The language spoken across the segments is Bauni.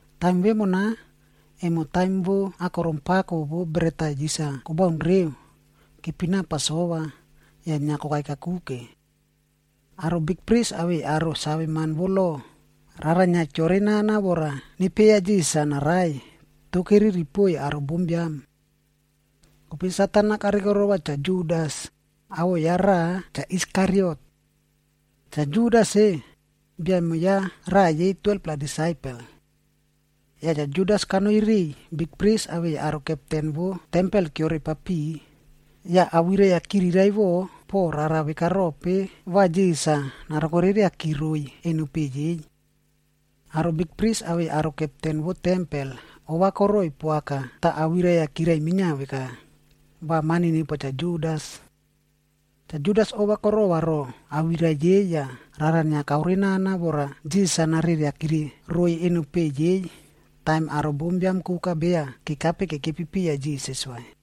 Taim vemona, emo taim vo Akorom Pako vo Bret-a Yis-a Kobaun reu,a kepina Pasova, yah inia kokai kakuke. Aro bikpris awei aro saveman vo lo, rara inia keore nana vora nepieya Jisas-a narai, toh keriri poiy aro bombiam. Kope Satan-a karikorova Cha Judas, awoꞌo ya raꞌa Cha Iskariot. Cha Judas-e, bia emo ya raꞌa yei 12-pla disaipel. Yah Cha Judas kanoi riꞌiy bikpris awei aro kepten vo tempel-a keore papiꞌi, yah awirai-a kiriraivoꞌo po rara veka rope va Jisas-a narokoreriaki roiy eno peꞌe yei. Aro bikpris awei aro kepten vo tempel ova koroꞌoiy poaka tah awirai-a kirai minia veka, va mani nepoa Cha Judas. Cha Judas ova korova roꞌo awirai yei yah rara inia kaore nana vora Jisas-a nareriakire roiy eno peꞌe yei, taim aro bombiam koka beya kekape kekepi piya Jisas vai.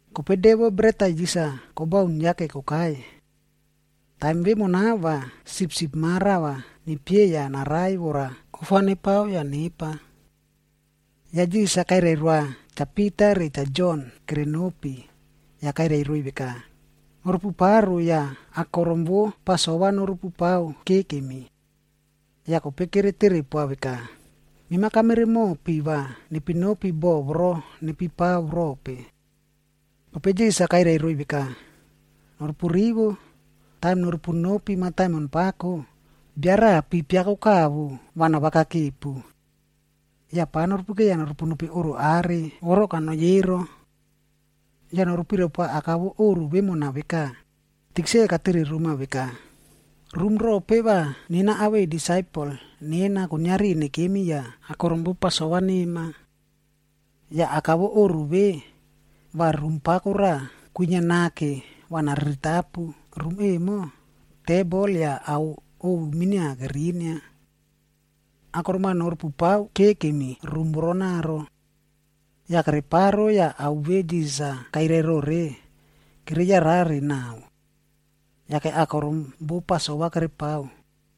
Kope De vo Bret-a Yis-a Kobaun yake kokai. Taim vemona va sipsip ma rava nepieya narai vora ofa nepao yah nepa. Yah Jisas-a kairai roa Cha Pita re Cha Jon kere nopi, yah kairai roiy veka, “Norupu paro yah akorom vo Pasova norupu pao kekemi.” Yah kope kere tere poa veka, “Mema kamere mopi va nepi nopi boꞌo voro nepipao rope?” Kope Jisas-a kairai roiy veka, “Norupu rivo, taim norupu nopi mataimon pako, bia raꞌa pi piako kavo va navakakepu. Yah pava nopekeiya norupu nopi oꞌro are voro kaute kanoi ero. “Yah norupirai poa aka vo oꞌro vemona veka, ‘Tikse katere roma veka, “Rum rope va nena awei disaipel nena kuiniari nekemi yah akorom vo Pasova nema?” ’ Yah aka vo oꞌro ve, va rum pako raꞌa kwinia nake va nariritapu. Rum emo, tebol yah ao ovu minia kerinia. Akorom-a norupupao kekemi rum voronaro.” Yah kereparo yah ao ve Jisas-a kairai rore, kere yarare naꞌao. Yake akorom vo Pasova kerepao.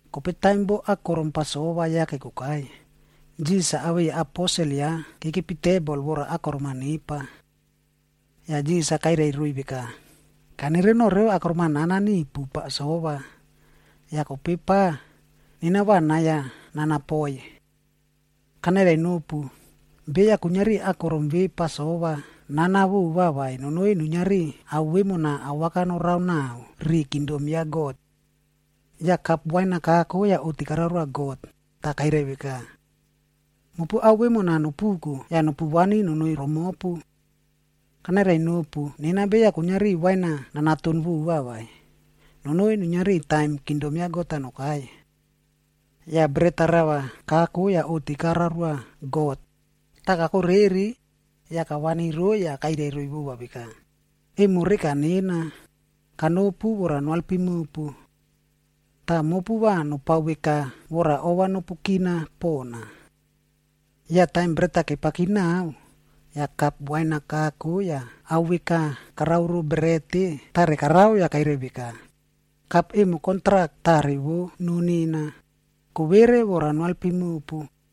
Kope taim vo akorom Pasova yake kokai, Jisas-a awei aposel ya kekepi tebol vora akorom-a nepa. Yah Jisas-a kairai roiy veka, “Kanere noꞌo revo akorom-a nana nipu Pasova, yah kope pa, nena va nai-a nanapoi. Kanairai nopu, beya kuiniari akorom ve Pasova nana vova vaib nonoi nuiniari ao vemona awaka norao naꞌao ri kingdom ya God.” Yah kap wain-a kako yah oꞌti karoa God, tah kairai veka, “Mopu ao vemona nopuko yah nopu vani nonoi romopu. Kanairai nopu, nena beya kuiniari wain-a nanaton vova vai, nonoi nuiniari taim kingdom God nokai.” Yah bret-a rava kako yah oꞌti karoa God, tah kakoreri, yah kavani roiy yah kairai roiy vova veka, “Emo reka nena, kanopu vora noalpim mopu. Tah mopu va nopao veka vora ova nopu kina pona.” Yah taim bret-a kepaki naꞌao, yah kap wain-a kako yah ao veka karao ro bret-e tare karao yah kairai veka, “Kap emo kontrak tarec vo noo nena, kovere vora noalpim mopu.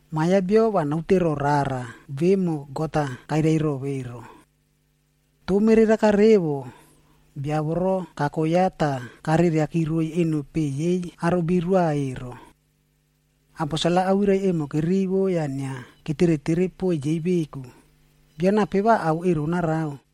Ma Biam ya Bio va naote roꞌo rara vemo God-a kairai ro ero. Toh, mereraka revo, bia voro kako ya tah kareriaki roiy eno peꞌe yei aro birua ero.” Aposel-a awirai emo kerivo yah inia ketere tere poiy yei veku, “Bio nape va ao ero narao?”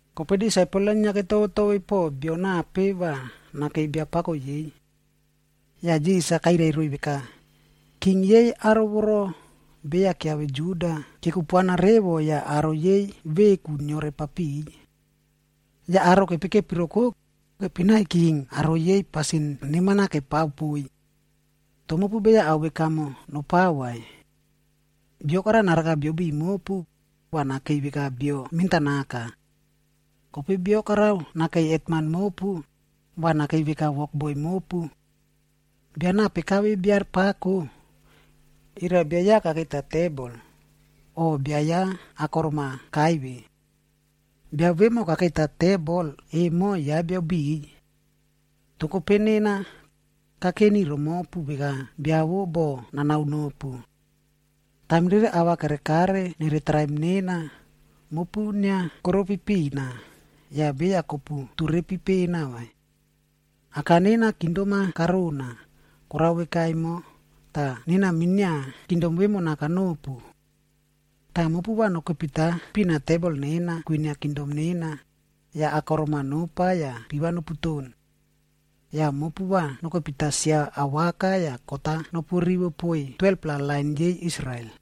Kope disaipel-a inia ketove tove po bio nape va nakei biapako yei. Yah Jisas-a kairai roiy veka, “King yei aro voro beya keave Juda, kekupuana revo yah aro yei veku kiore papiꞌiy. Yah aro kepeikepi roko, kepinai king veka aro yei pasin neman-a kepao poiy. Toh mopu beya ao veka emo nopao vai. Bio karao naraka biabiꞌiy mopu, va nakei veka bio mentanaka. Kope bia karao nakei hetman mopu, va nakei veka wokboi mopu. Bia nape kave bia pako? Era bia ya kakeita tebol, o bia ya akorom-a kaive?d Bia vemo kakeita tebol emo ya bia biꞌiy. Toh kope nena, kakeni romopu veka bia vo boꞌo nanao nopu. Taim rere ava kerekare nere traim nena, mopu inia koropi pina, yah beya kopu turepi pena vai. Aka nena kingdom-a karona, korao veka emo, tah nena minia kingdom vemona kanopu. Tah mopu va nokepita pina tebol nena kwinia kingdom nena, yah akorom-a nopa yah piva noputon. Yah mopu va nokepita sia awaka yah kot-a nopu rivo poiy 12-pla lain yei Israel.”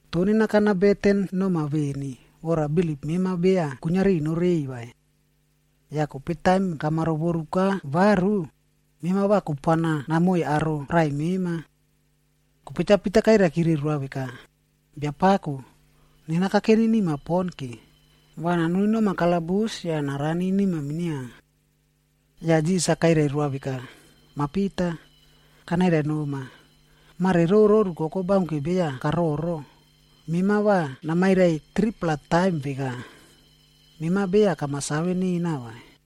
Toh nena kana beten noma veni, vora bilip mema beya kuiniari norei vai. Yah kope taim kama rovoruka varu, mema va kupuana namoiy aro raꞌai mema.” Kope Cha Pita kairaikire roa veka, “Biapako, nena kakeni nima pon ke, va nanoni noma kalabus yah narani nima minia.” Yah Jisas-a kairai roa veka, “Mah Pita, kanairai noma, mare roro rukoko baunke beya kaororo, mema va namairai 3-pla taim veka, mema beya kama save nena vai.”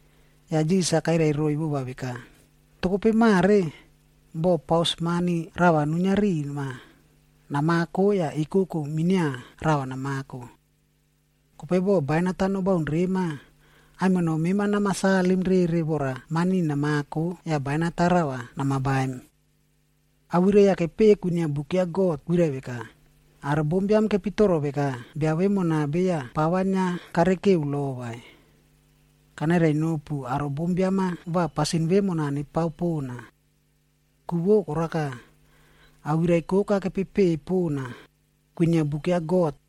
Yah Jisas-a kairai roiy vova veka, “Toh kope mare, boh paus mani rava nuinia rima, namako yah ekoko minia rava namako. Kope boh bainat-a nobaun rema, aimino mema nama salim rere vora mani namako yah bainat-a rava nama baim. Awirai-a kepeꞌe kwinia buk ya God kwirai veka, ‘Aro bombiam kepitoro veka bia vemona beya pava inia karikeu lo vai.’ Kanairai nopu aro bombiam-a va pasin vemona nepao pona. Ku vo koraka, awirai koka kepepeꞌe pona, kwinia buk ya God,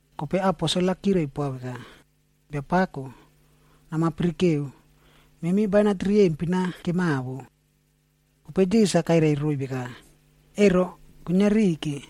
Kope aposel-a kirai poa veka, “Biapako, nama pirikeu, memi bainat riyempin-a kemawo.” Kope Jisas-a kairai roiy veka, “Ero, kuiniari ke.”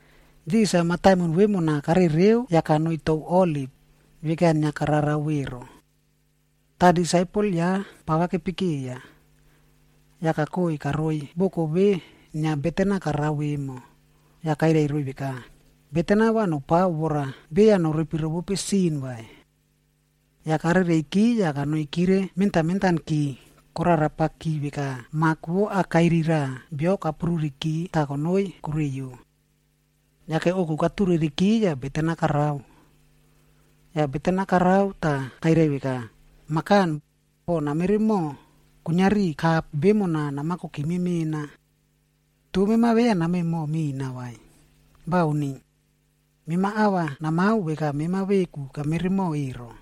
Jisas-a mataimon vemona karereu yah kakoi tou Oliv, veka inia kararao ero. Tah disaipel ya pava kepekeiya. Yah kakoi karoi boko ve inia beten-a karao vemo, yah kairai roiy veka, “Beten-a va nopao vora beya norepi rovope sin vai.” Yah karereiki yah kanoikire mentan mentanki, korarapaki veka mak vo akairi raꞌa bio kapruriki tah konoi koreiyo. Yake ouku katureriki yah beten-a karao. Yah beten-a karao tah kairai veka, “Mah Kan, boh nameremoꞌo, kuiniari kapg vemona nama kokime mena. Toh mema beya namemo mina vai. Bauni. Mema ava namao veka mema veku kameremoꞌo ero.”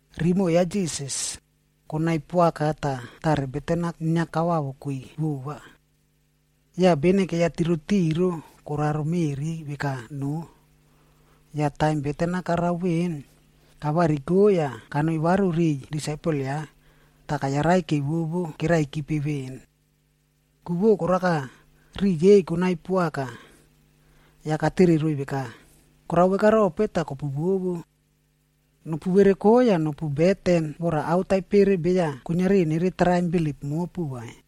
Rimoꞌo ya Jisas, konai poaka tah tare beten-a inia kaowawoki vova. Yah bene keiya tirotiro koraro meꞌri veka noo. Yah taim beten-a karao veꞌen, kavariko yah kanoi varu riꞌiy disaipel ya, tah kayarai kevovo keraikipe veꞌen. Ku vo koraka, riꞌi yei konai poaka. Yah katere roiy veka, “Korao vekarope tah kopuvovo? Nopu vereko yah nopu beten vora ao taipere beya kuiniari nere traim bilip mopu vai.”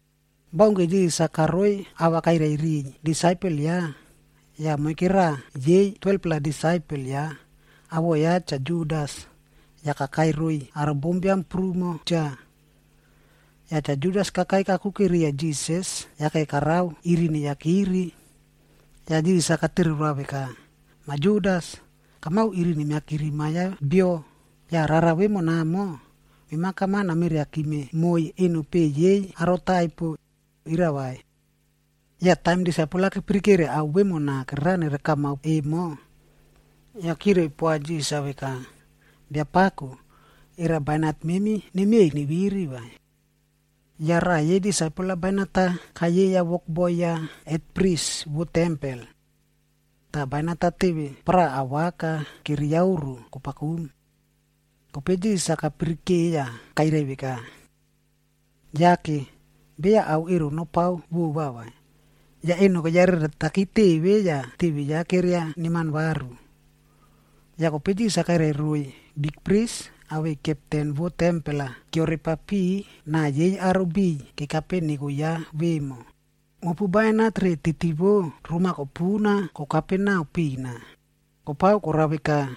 Baunke Jisas-a karoiy ava kairai riꞌiy disaipel ya, yah moike raꞌa yei 12-pla disaipel ya, awoꞌo ya Cha Judas, yah kakai roiy aro biam prumo cha. Cha Judas kakai kakuke riya Jisas yake karao iri neiyakiri. Yah Jisas-a katere roa veka, “Mah Judas, kamao iri nemiakiri Ma Biam ya Bio, yah rara vemonamo, mema kameriakime moiy eno peꞌe yei aro taipo, era vai?” Yah taim disaipel-a kepirikere ao vemona kererao nere kamap emo, yah kirai poa Jisas-a veka, “Biapako, era bainat memi nemiey neviri vai?” Yah raꞌa yei disaipel-a bainat-a kayeiya wokboi ya hetpris vo tempel. Tah bainat-a teve paraꞌa awaka keriaoro kopakum. Kope Jisas-a kapirike yah kairai veka, “Yake! Beya ao ero nopao vova vai!” Yah eno keyareretaki teve yah teve ya keria neman varu. Yah kope Jisas-a kairai roiy bikpris awei kepten vo tempel-a keore papiꞌi na yei aro biꞌiy kekape neko ya vemo, “Mopu bainat re titi vo roma kopuna kokape nao pina, kopao korao veka,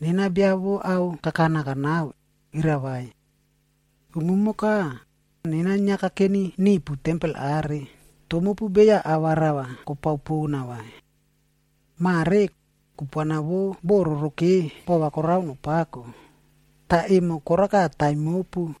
nena bia vo ao kakana kanao, era vai? Umumoka, nena inia kakeni nipu tempel are, toh mopu beya ava rava kopao pona vai. Mare, kupuana vo bo roroke bova karao pako, tah emo koraka taim mopu.”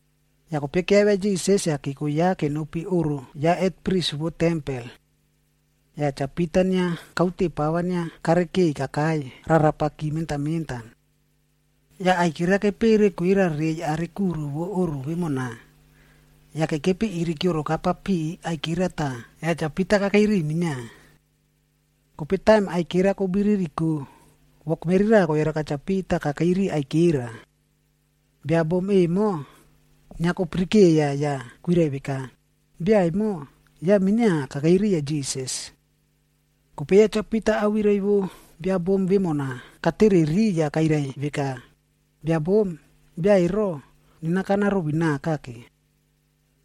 Yah kope keavia Jisas yah keko ya kenopi oꞌro ya hetpris vo tempel. Yah Cha Pita inia kaute pava inia karikeiy kakai rarapaki mentan mentan. Yah aikera kepere kwera rei are kuro vo oꞌro vemona, yah kekepi iri keoroka papiꞌi aikera tah ya Cha Pita kakei riꞌiy minia. Kope taim aikera kobiririko, wokmeri raꞌa koyaraka Cha Pita kakei ri aikera. Bia bom emo, inia kopirikeiya yah kwirai veka, “Bia emo, ya minia kakei riya Jisas.” Kope ya Cha Pita awirai vo bia bom vemona katereri yah kairai veka, “Bia bom, bia ero, nena kana rovinaka ke.”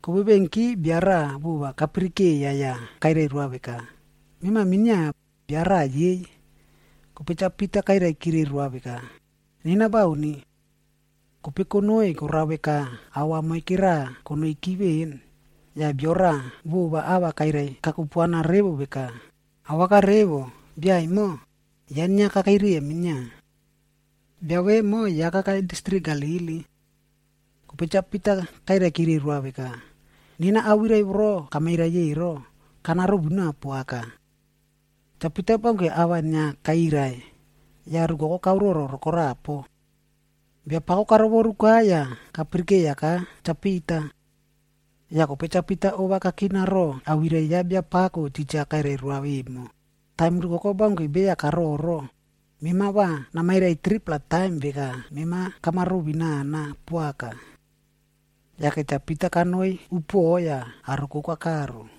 Kovevenki bia raꞌa vova kapirikeiya yah kairai roa veka, “Mema minia, bia raꞌa yei.” Kope Cha Pita kairaikire roa veka, “Nena bauni.” Kope konoi korao veka aua moike raꞌa konoiki veꞌen, yah bio raꞌa vova ava kairai kakupuana revo veka, “Awaka revo, bia emo, ya inia kakei riya minia. Bia vemo ya kakai distrik Galili.” Kope Cha Pita kairaikire roa veka, “Nena awirai voro kamairai ero, kana rovinao poaka.” Cha Pita baunke ava inia kairai, yah rukoko kaororo rokorapo. Biapako karovoruka yah kapirikeiyaka Cha Pita. Yah kope Cha Pita ova kakina ro awirai ya Biapako titja kairai roa vemo, “Taim rukoko baunke beya kaororo, mema va namairai 3-pla taim veka mema kama ruvinana poaka.” Yake Cha Pita kanoi upuoꞌo yah aro koka karo.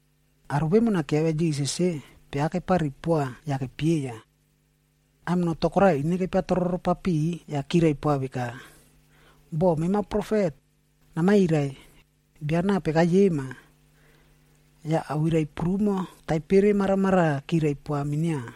Aro vemona keavia Jisas-e, piava kepari poa yah kepieya. Aimino to koraꞌa ineva kepiatroro papiꞌi yah kirai poa veka, “Boh mema profet, namairai, bia nape kayema?” Yah awirai prumo taipere maramaraꞌa kirai poa minia.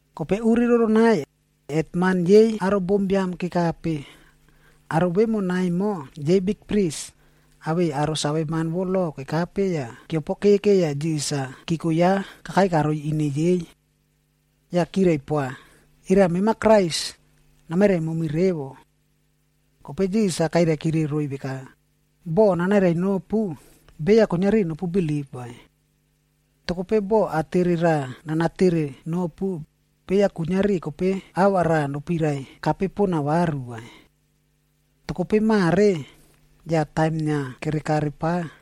Kope uri roronai, hetman yei aro bombiam kekape. Aro vemona emo yei bikpris, awei aro saveman vo lo kekape yah keopokeke yah Jisas-a keko ya kakai karoi ine yei. Yah kirai poa, “Era mema Krais, namairai momi revo.” Kope Jisas-a kairaikire roiy veka, “Boh nanairai nopu, beya kuiniari nopu bilip vai. Toh kope boh atere raꞌa nana tere nopu, beya kuiniari kope ava raꞌa nopirai kape pona varu vai. Toh kope mare, yah taim inia kere kare pa,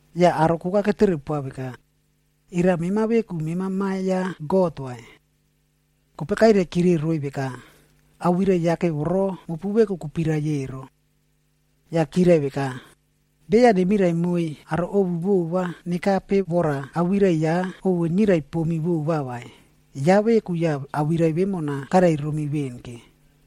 Yah aro koka ketere poa veka, “Era mema veku mema Ma ya God vai?” Kope kairaikire roiy veka, “Awirai yake voro mopu veku kopirai ero.” Yah chirai veka, “Beya nemirai moiy aro ovu vova nekape vora awirai ya ovu nirai pomi vova vai, ya veku yah awirai vemona kairai romi veꞌen ke.”